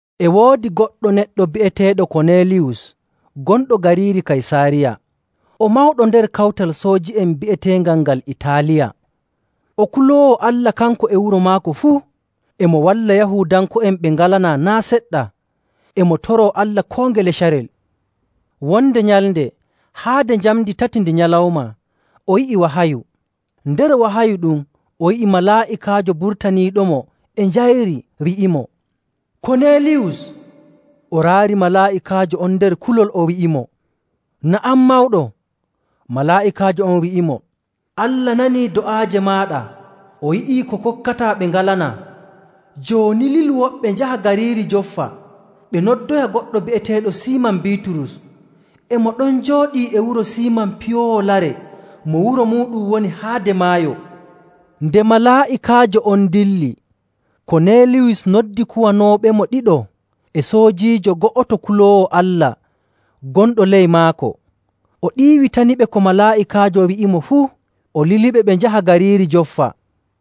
E woodi goɗɗo neɗɗo bi'eteeɗo Koneeliyus gonɗo gariiri Kaysaariya. O mawɗo nder kawtal sooji'en bi'eteengal ngal Itaaliya. O kuloowo Allah, kanko e wuro maako fuu. E mo walla Yahuudanko'en ɓe ngalanaa naa' seɗɗa, e mo toroo Allah koo ngele carel. Wonde nyalnde haade njamndi tati ndi nyalawma o yi'i wahayu. Nder wahayu ɗum o yi'i malaa'ikaajo burtaniiɗomo e njayri, wi'imo, “Koneeliyus!” O raari malaa'ikaajo on nder kulol, o wi'imo, “Na'am, Mawɗo?” Malaa'ikaajo on wi'imo, “Allah nanii do'aaje maaɗa o yi'ii ko kokkataa ɓe ngalanaa. Jooni lilu woɓɓe njaha gariiri Joffa ɓe noddoya goɗɗo bi'eteeɗo Siiman Biiturus. E mo ɗon jooɗii e wuro Siiman piyoowo lare mo wuro muuɗum woni haade maayo.” Nde malaa'ikaajo on dilli, Koneeliyus noddi kuwanooɓemo ɗiɗo e soojiijo go'oto kuloowo Allah gonɗo ley maako. O ɗiiwitaniɓe ko malaa'ikaajo wi'imo fuu, o liliɓe ɓe njaha gariiri Joffa.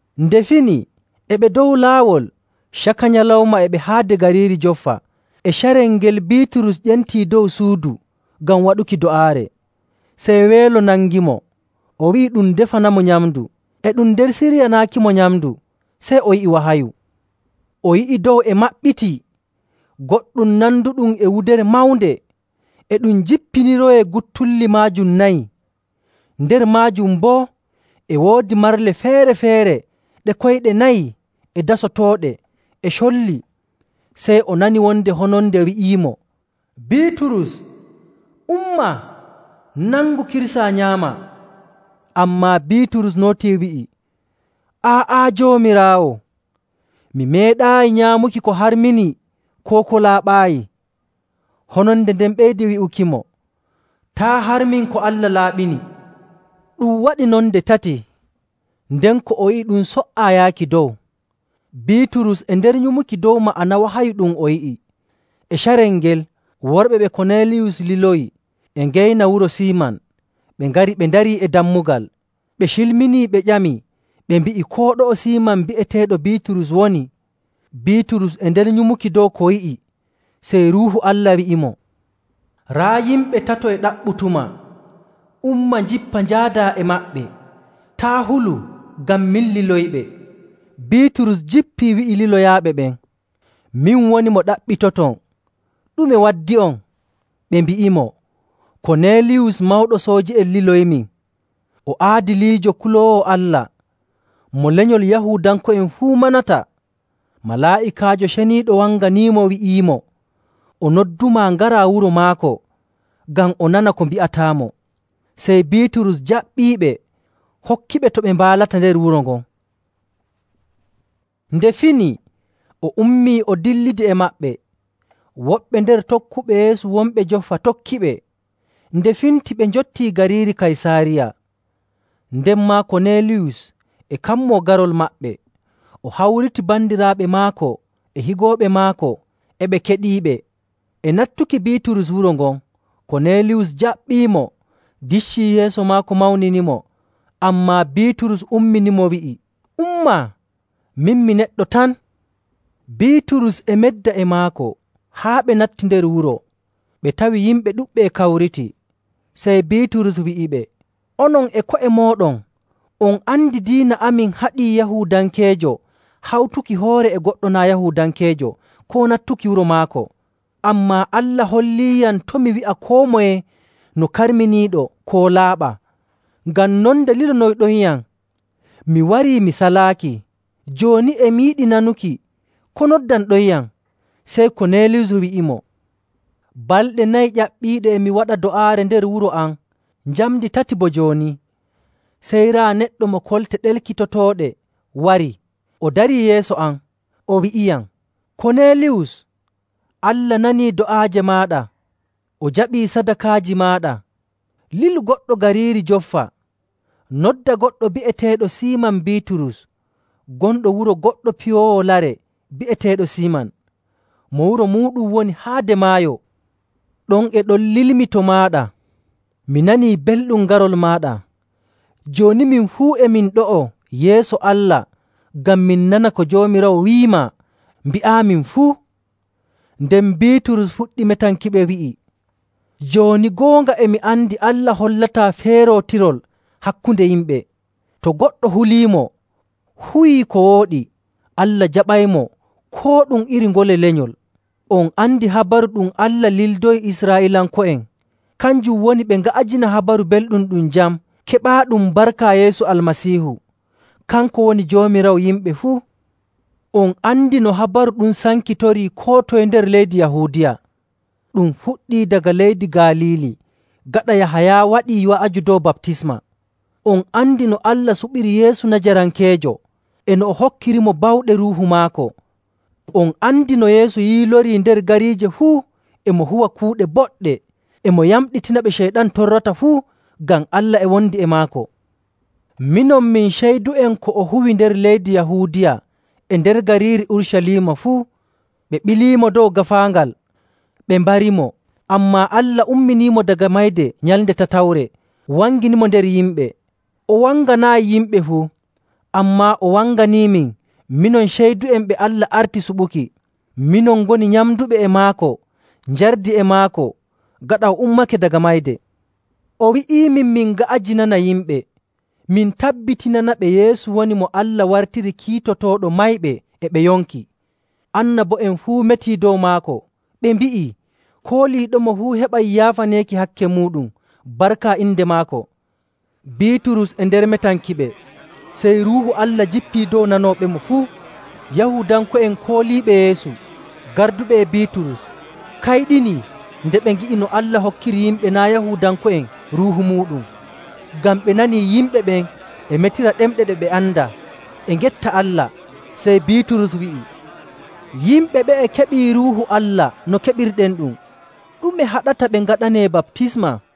Nde fini e ɓe dow laawol, caka nyalawma e ɓe haade gariiri Joffa, e carel ngel Biiturus ƴenti dow suudu ngam waɗuki do'aare. Sey weelo nangimo, o wi'i ɗum defanamo nyamndu. E ɗum nder siryanaakimo nyamndu, sey o yi'i wahayu. O yi'i dow e maɓɓitii, goɗɗum nanduɗum e wudere mawnde e ɗum jippiniroyee guttulli maajum nayi. Nder maajum boo e woodi marle feere‑feere ɗe koyɗe nayi, e dasotooɗe, e colli. Sey o nani wonde hononde e wi'amo, “Biiturus, umma, nangu, kirsaa, nyaamaa!” Ammaa Biiturus nootii wi'i, “Aa'a, Joomiraawo! Mi meeɗaayi nyaamuki ko harminii koo ko laaɓaayi.” Hononde nden ɓeydi wi'ukimo, “Taa' harmin ko Allah laaɓini.” Ɗum waɗi non nde tati. Nden ko o yi'i ɗum so''aa yaaki dow. Biiturus e nder nyumuki dow ma'ana wahayu ɗum o yi'i. E carel ngel, worɓe ɓe Koneeliyus liloyi e ngeyna wuro Siiman. Ɓe ngari, ɓe ndarii e dammugal. Ɓe cilminii, ɓe ƴami, ɓe mbi'i koo ɗo'o Siiman bi'eteeɗo Biiturus woni. Biiturus e nder nyumuki dow ko o yi'i, sey Ruuhu Allah wi'imo, “Raa yimɓe tato e ɗaɓɓutumaa. Umma jippa, njaadaa e maɓɓe. Taa' hulu, ngam min liloyiɓe.” Biiturus jippii, wi'i liloyaaɓe ɓen, “Min woni mo ɗaɓɓitoton. Ɗume waddi'on?” Ɓe mbi'imo, “Koneeliyus mawɗo sooji'en liloyimin. O aadiliijo, kuloowo Allah, mo lenyol Yahuudanko'en fuu manata. Malaa'ikaajo ceniiɗo wanganiimo wi'iimo o noddumaa ngaraa wuro maako, ngam o nana ko mbi'ataamo.” Sey Biiturus jaɓɓiiɓe, hokkiɓe to ɓe mbaalata nder wuro ngon. Nde fini, o ummii o dillidi e maɓɓe. Woɓɓe nder tokkuɓe Yeesu wonɓe Joffa tokkiɓe. Nde finti ɓe njottii gariiri Kaysaariya. Nden maa Koneeliyus e kammoo garol maɓɓe, o hawriti bandiraaɓe maako e higooɓe maako e ɓe keɗiiɓe. E nattuki Biiturus wuro ngon, Koneeliyus jaɓɓiimo, diccii yeeso maako mawninimo. Ammaa Biiturus umminimo, wi'i, “Umma. Min mi neɗɗo tan.” Biiturus e medda e maako, haa ɓe natti nder wuro, ɓe tawi yimɓe ɗuɗɓe e kawriti. Sey Biiturus wi'iɓe, “Onon e ko'e mooɗon on andi diina amin haɗii Yahuudankeejo hawtuki hoore e goɗɗo naa' Yahuudankeejo koo nattuki wuro maako. Ammaa Allah holliiyam to' mi wi'a koo moye no karminiiɗo koo laaɓaa. Ngam non nde lilonoyɗonyam, mi warii mi salaaki. Jooni e mi yiɗi nanuki ko noddanɗonyam.” Sey Koneeliyus wi'imo, “Balɗe nayi ƴaɓɓiiɗe e mi waɗa do'aare nder wuro am njamndi tati bo jooni. Sey raa, neɗɗo mo kolte ɗelkitotooɗe warii, o darii yeeso am. O wi'iyam, ‘Koneeliyus, Allah nanii do'aaje maaɗa o jaɓii sadakaaji maaɗa. Lilu goɗɗo gariiri Joffa, noddaa goɗɗo bi'eteeɗo Siiman Biiturus gonɗo wuro goɗɗo piyoowo lare bi'eteeɗo Siiman, mo wuro muuɗum woni haade maayo.’ Ɗon e ɗon lilmi to maaɗa. Mi nanii belɗum garol maaɗa. Jooni min fuu e min ɗo'o yeeso Allah ngam min nana ko Joomiraawo wi'imaa mbi'aamin fuu.” Nden Biiturus fuɗɗi metankiɓe wi'i, “Jooni goonga e mi andi Allah hollataa feerootirol hakkunde yimɓe.. To goɗɗo huliimo, huwii ko wooɗi, Allah jaɓaymo koo ɗum iri ngole lenyol. On andi habaru ɗum Allah lildoyi Israa'iilanko'en. Kanjum woni ɓe nga'ajina Habaru Belɗum, ɗum jam keɓaaɗum barka Yeesu Almasiihu. Kanko woni Joomiraawo yimɓe fuu. On andi no habaru ɗum sankitorii koo toye nder leydi Yahuudiya. Ɗum fuɗɗii daga leydi Galiili gaɗa Yahaya waɗii wa'aju dow baptisma. On andi no Allah suɓiri Yeesu Najarankeejo, e no o hokkirimo bawɗe Ruuhu maako. On andi no Yeesu yiilorii nder gariije fuu e mo huwa kuuɗe boɗɗe, e mo yamɗitina ɓe Ceyɗan torrata fuu ngam Allah e wondi e maako. Minon min ceydu'en ko o huwi nder leydi Yahuudiya e nder gariiri Urucaliima fuu. Ɓe ɓilimo dow gaafaangal, ɓe mbarimo, ammaa Allah umminimo daga mayde nyalnde tatawre, wanginimo nder yimɓe. O wanganaayi yimɓe fuu, ammaa o wanganiimin minon ceydu'en ɓe Allah arti suɓuki. Minon ngoni nyamnduɓe e maako njardi e maako gaɗa o ummake daga mayde. O wi'imin min nga'ajinana yimɓe, min tabbitinanaɓe Yeesu woni mo Allah wartiri kiitotooɗo mayɓe e ɓe yonki. Annabo'en fuu metii dow maako ɓe mbi'ii kooliiɗomo fuu heɓay yaafaneeki hakke muuɗum barka inde maako.” Biiturus e nder metankiɓe, sey Ruuhu Allah jippii dow nanooɓemo fuu. Yahuudanko'en kooliiɓe Yeesu garduɓe e Biiturus kayɗinii nde ɓe ngi'i no Allah hokkiri yimɓe naa' Yahuudanko'en Ruuhu muuɗum, ngam ɓe nanii yimɓe ɓen e metira ɗemɗe ɗe ɓe andaa, e ngetta Allah. Sey Biiturus wi'i, “Yimɓe ɓe'e keɓii Ruuhu Allah no keɓirɗenɗum. Ɗume haɗata ɓe ngaɗanee baptisma?”